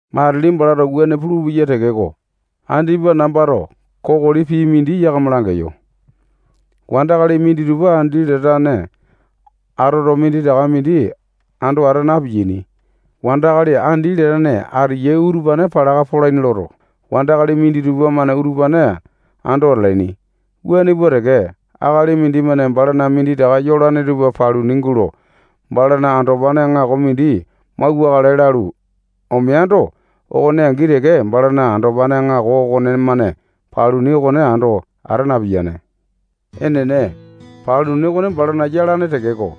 Matili balato wuane pulupeya tekeko, andipa nambato kokoli pii mindi yakama langeyo. Wandakali minditupa andi latane atoto, minditaka mindi ando ata na-piyaini. Wandakali andi latane ateyai utupane palaka polaini loto, wandakali minditupa-mane utupane ando atalaini. Wuane pua teke, akali mindimane balana minditaka yolane tupa paluni gulo, balana andopane aŋako mindi mauwakale lalu omeando, okone angi teke balana andopane aŋako okonemane paluni okone ando ata napiyane. Enene, paluni okone balana yalane tekeko,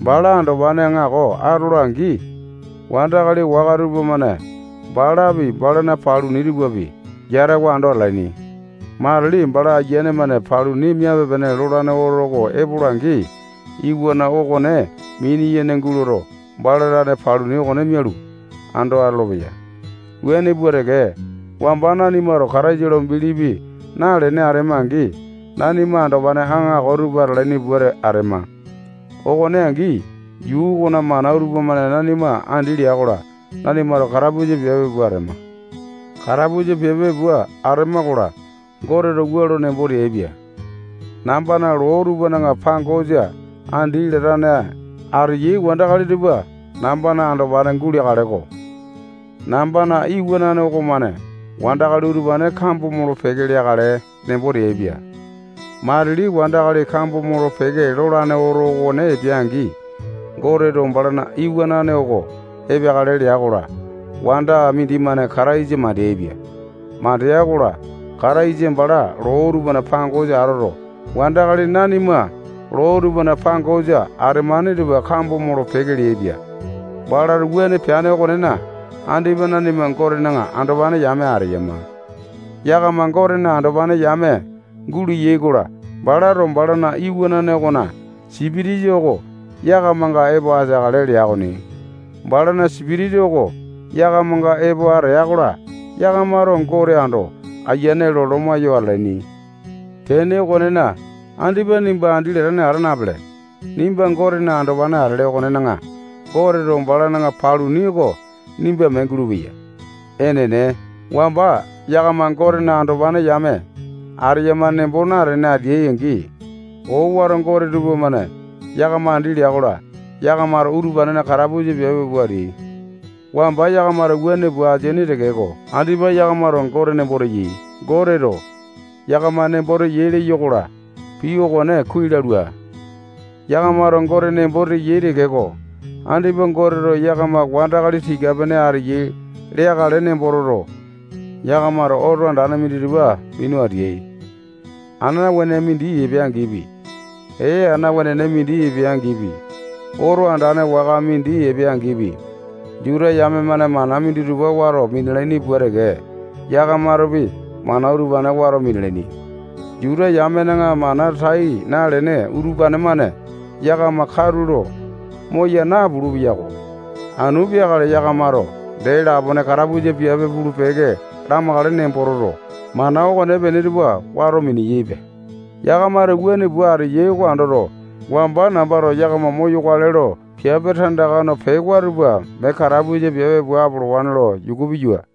bala andopane aŋako atola-angi, wandakali waka tupamane balapi, balana paluni tupapi, yatawa ando atalaini. Matili bala ayiane-mane paluni miape lolane oto okone epola-angi, iwana okone mini-yene guloto, bala tane paluni okone mialu, ando atolopeya. Wuane pua teke, wamba nanimato Kataisa lo bilipi nalene atema-angi, nanima andopane aŋako tupa atalaini pua atema. okone angi yuu okona mana tupamane nanima andi lea-kola, nanimato katapusa piape pua atema. Katapusa piape pua atema-kola, Goteto wua lo nembo teaipia: Nambana loo tupana pangosa andi latane ateyai wandakali tupa nambana andopane guleakale-ko. Nambana iwanane okomane wandakali utupane kambo molo-peke leakale nembo teaipia. Matili wandakali kambo molo-peke lolane oto okone epea-angi, Goteto balana iwanane oko epeakale lea-kola, wanda mindimane Kataisa mandeaipia. Mandea-kola, Kataisa bala loo tupana pangosa atoto, wandakali nanima loo tupana pangosa atemane tupa kambo molo-peke leaipia. Balato wuane peane okonena, andipa nanima Gotena andopane yame ateyama. Yakama Gotena andopane yame guleai-kola, balato balana iwanane okona Sipitisa oko yakamanga epo ateakale lea okoni. Balana Sipitisa oko yakamanga epo ateya-kola, yakamato Gote ando ayiane lo loma yo atalaini. Tene okonena, andipa nimba andi latane ata napele. Nimba Gotena andopane atele okonena, Goteto balana paluni oko nimba mee gulupeya. Enene, wamba yakama Gotena andopane yame ateyama nembo natene ateai-angi, owato gote tupamane yakama andi leai-kola, yakamato utupanena katapusa piape pua ateai. Wamba yakamato wuane pua ateaini tekeko, andipa yakamato Gote nembo teyai. Goteto yakama nembo teya leyo-kola, pii okone kuai lalua. Yakamato Gote nembo teyai tekeko, andipa Goteto yakama wandakali tika-pene ateyai leakale nembo toto, yakamato oto andane minditupa minu ateyai. Ana wenene mindi epeya-angipi, ee ana wenene mindi epeya-angipi, oto andane waka mindi epeya-angipi, Juta yame-mane mana minditupa wato minalaini pua teke, yakamatopi mana utupane wato minalaini. Juta yamena mana tai nalene utupane-mane yakama katulo moya napulu-peyako. Anu peakale yakamato dee lapone katapusa piape pulu-peke lamakale nembo toto, mana okonepene tupa wato miniyaipe. Yakamato wuane pua ateyai oko andoto, wamba nambato yakama moyokale lo piape tandaka no pewa tupa mee katapusa piape pua apolowane lo yuku piyua.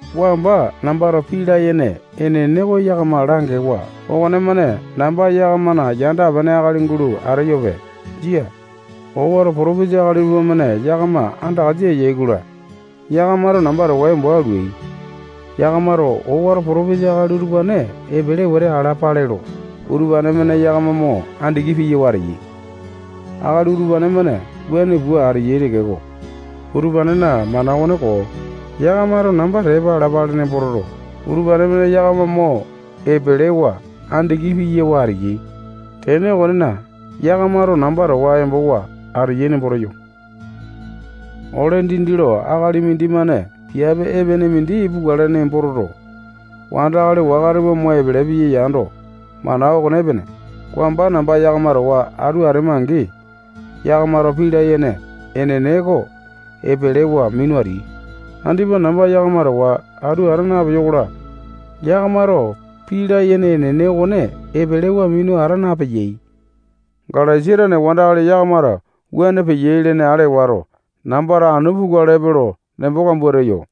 Wamba nambato pii layene enene oko yakama langewa okonemane namba yakamana yanda-pene akali gulo ateyope. Jia. owato potopesa akali tupamane yakama andakasa eyai-kola, yakamato namba towa embo alui. Yakamato owato potopesa akali utupane epele wete alapale lo, utupane-mane yakama mo andiki piyawa ateyai. Akali utupane-mane wuane pua ateyai tekeko, utupanena mana okone koo. Yakamato namba tepa alapale nembo toto, utupane-mane yakama mo epelewa, andiki piyawa ateyai. Tene okonena, yakamato namba towa embowa ateyai nembo teyo. Ole dindi lo akali mindimane piape epene mindi pukale nembo toto, wandakali waka tupa mo epele piya yando, mana okone epene. Wamba namba yakama towa atu atema-angi, yakamato pii layene enene oko epelewa minu ateai. Andipa namba yakama towa atu ata napeyo-kola, yakamato pii layene enene okone epelewa minu ata napeyai. Galesia tane wandakali yakamato wuane peyai lene ale wato, nambato anu pukalepe lo nembo kambua teyo.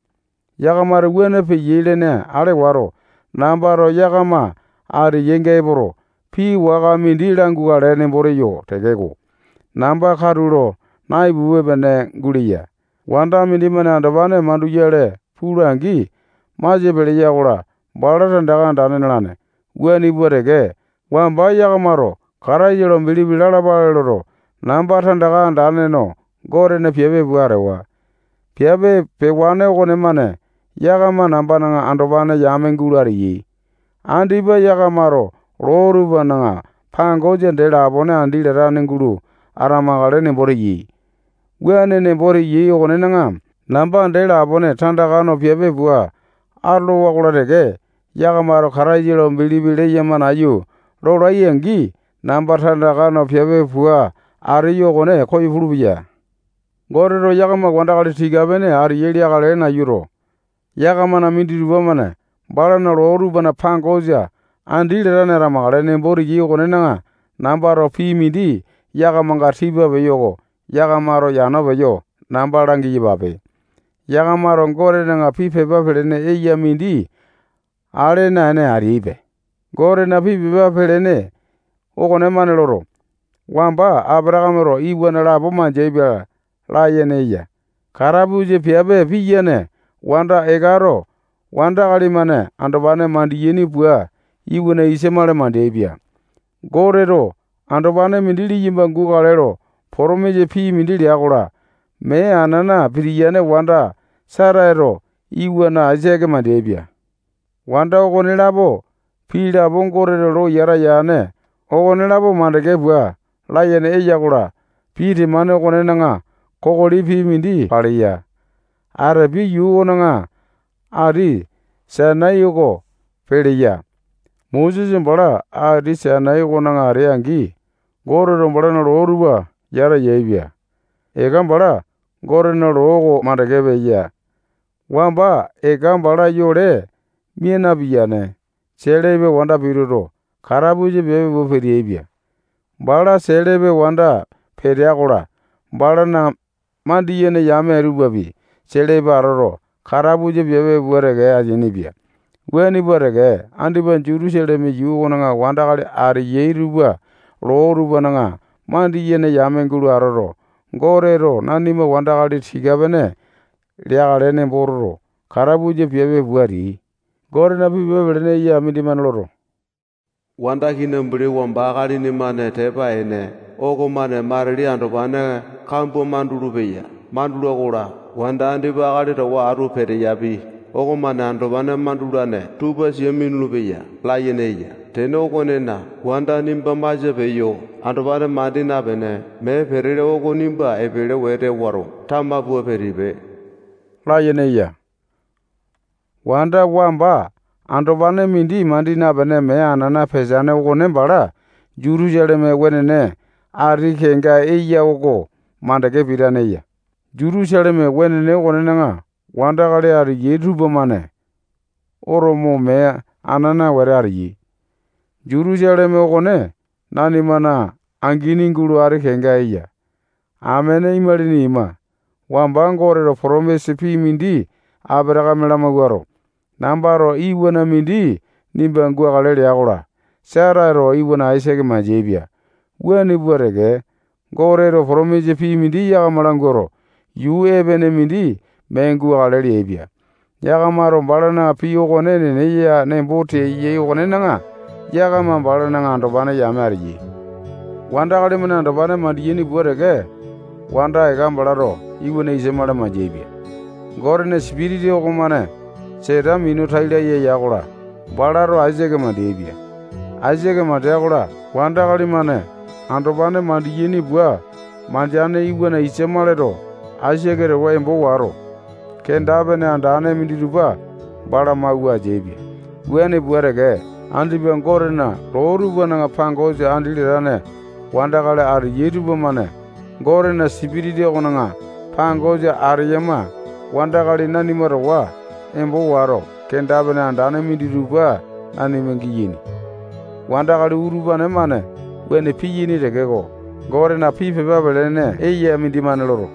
Yakamato wuane peyai lene ale wato, nambato yakama ateyainga epoto, pii waka mindi langukale nembo teyo tekeko, namba katulo naipupe-pene guleya. Wanda mindimane andopane manduyale pula-angi, masia peleya-kola, bala tandaka andane nalane. Wuane pua teke, wamba yakamato Kataisa lo bilipi lalapale loto, namba tandaka andane no Gotena piape pua atewa. Piape pewane okonemane yakama nambana andopane yame gulo ateai. Andipa yakamato loo tupana pangosa dee lapone andi latane gulo atamakale nembo teyai. Wuane nembo teyai okonena, namba dee lapone tandaka no piape pua atolowa-kola teke, yakamato Kataisa lo bilipi leyama nayu lolai-angi, namba tandaka no piape pua ateyo okone koyo pulupeya. Goteto yakama wandakali tika-pene ateyai leakale nayuto, yakamana minditupa-mane balana loo tupana pangosa andi latane atamakale nembo teyai okonena, nambato pii mindi yakamanga tipa peyo oko yakamato yano peyo namba langi-yapape. Yakamato Gotena pii pepa pelene eya mindi ale naene ateyaipe. Gotena pii pepa pelene okonemane loto, wamba Apatakameto iwana lapo mandeaipia layene eya. Katapusa piape piyane wanda Ekato wandakali-mane andopane mandiyaini pua iwana Isamale mandeaipia. Goteto andopane mindi liyamba gukale lo potomisa pii mindi lea-kola, mee anana pitiyane wanda Setato iwana Aisake mandeaipia. Wanda okonelapo pii lapo Goteto lo yata yane okolapo mandeke pua layene eya-kola, pii temane okonena kokoli pii mindi paleya. Atepia yuu okona Ati Sainai oko peleya. Mosesa bala Ati Sainai okona atea-angi, Goteto balana loo tupa yata yaepia. Eka bala Gotena loo oko mandeke peya. Wamba Eka bala yole mia napiyane selepe wanda pituto, katapusa piape pua peteaipia. Bala selepe wanda petea-kola, balana mandiyene yame tupapi selepe atoto, katapusa piape pua teke ateainipia. Wuane pua teke, andipa Jutusaleme yuu okona wandakali ateyai tupa loo tupana mandiyene yame gulo atoto, Goteto nanima wandakali tika-pene leakale nembo toto, katapusa piape pua ateyai. Gotena pii pepa pelene eya mindimane loto, wanda kinambuli wamba akalini-mane tepa ene okomane matili andopane kambua mandulu-peya. Mandula-kola, wanda andipa akali towa atu peteyapi okomane andopane mandulane tupa sia minulu-peya layene eya. Tene okonena, wanda nimba masia peyo, andopane mandi napene, mee petele oko nimba epele wete wato, tama pua pitipe layene eya. Wanda wamba andopane mandi napene mee anana peteane okone bala Jutusaleme wenene ati kenga eya oko mandeke pitane eya. Jutusaleme wenene okonena wandakali ateyai tupamane oto mo, mee anana wete ateyai. Jutusaleme okone nanimana angini gulo, ati kenga eya. Amene imalini ima, wamba Goteto potomisa pii mindi Apatakame lamawuato, nambato iwana mindi nimba gukale lea-kola, Setato iwana Aisake mandeaipia. Wuane pua teke, Goteto potomisa pii mindi yakama languato, yuu epene mindi mee gukale leaipia. Yakamato balana pii okone enene ya nembo teyai okonena, yakama balana andopane yame ateyai. Wandakali-mane andopane mandiyaini pua teke, wanda Eka balato iwana Isamale mandeaipia. Gotena Sipitisa okomane Seta minu tai laya ya-kola, balato Aisake mandeapia. Aisake mandea-kola, wandakali-mane andopane mandiyaini pua mandeane iwana Isamaleto Aisake towa embo wato, kenda-pene andane minditupa bala mawua ateaipia. Wuane pua teke, andipa Gotena loo tupana pangosa andi latane wandakali ateyai tupamane Gotena Sipitisa okona pangosa ateyama wandakali nanima towa embo wato, kenda-pene andane minditupa nanima giyaini. Wandakali utupane-mane wuane piyaini tekeko, Gotena pii pepa pelene eya mindimane loto,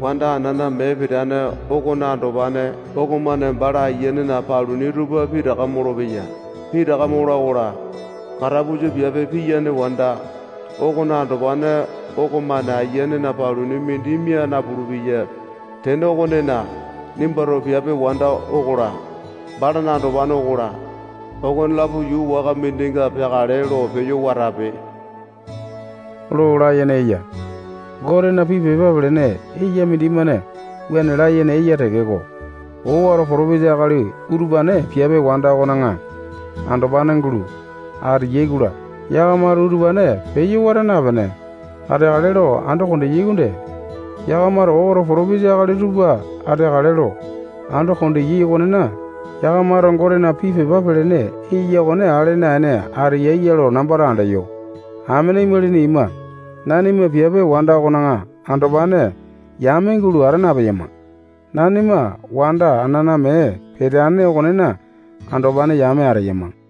wanda anana mee peteane okona andopane okomane bala ayianena paluni tupa pitaka molopeya. Pitaka mola-kola, katapusa piape piyane wanda okona andopane okomane ayianena paluni mindi mia napulu-peya. Tene okonena, nimbato piape wanda okola, balana andopane okola, okonelapo yuu waka mindinga peakale lo peyo watape lo layene eya. Gotena pii pepa pelene eya mindimane wuane layene eya tekeko, owato potopesa akali utupane piape wanda okona andopane gulo ateyai-kola, yakamato utupane peyo wata napene, ateakale lo ando kondeyai okonde. Yakamato owato potopesa akali tupa ateakale lo ando kondeyai okonena, yakamato Gotena pii pepa pelene eya okone ale naene ateyai ya lo nambato andeyo. Amene imalini ima, nanima piape wanda okona andopane yame gulo ata napeyama. Nanima wanda anana mee peteane okonena andopane yame ateyama.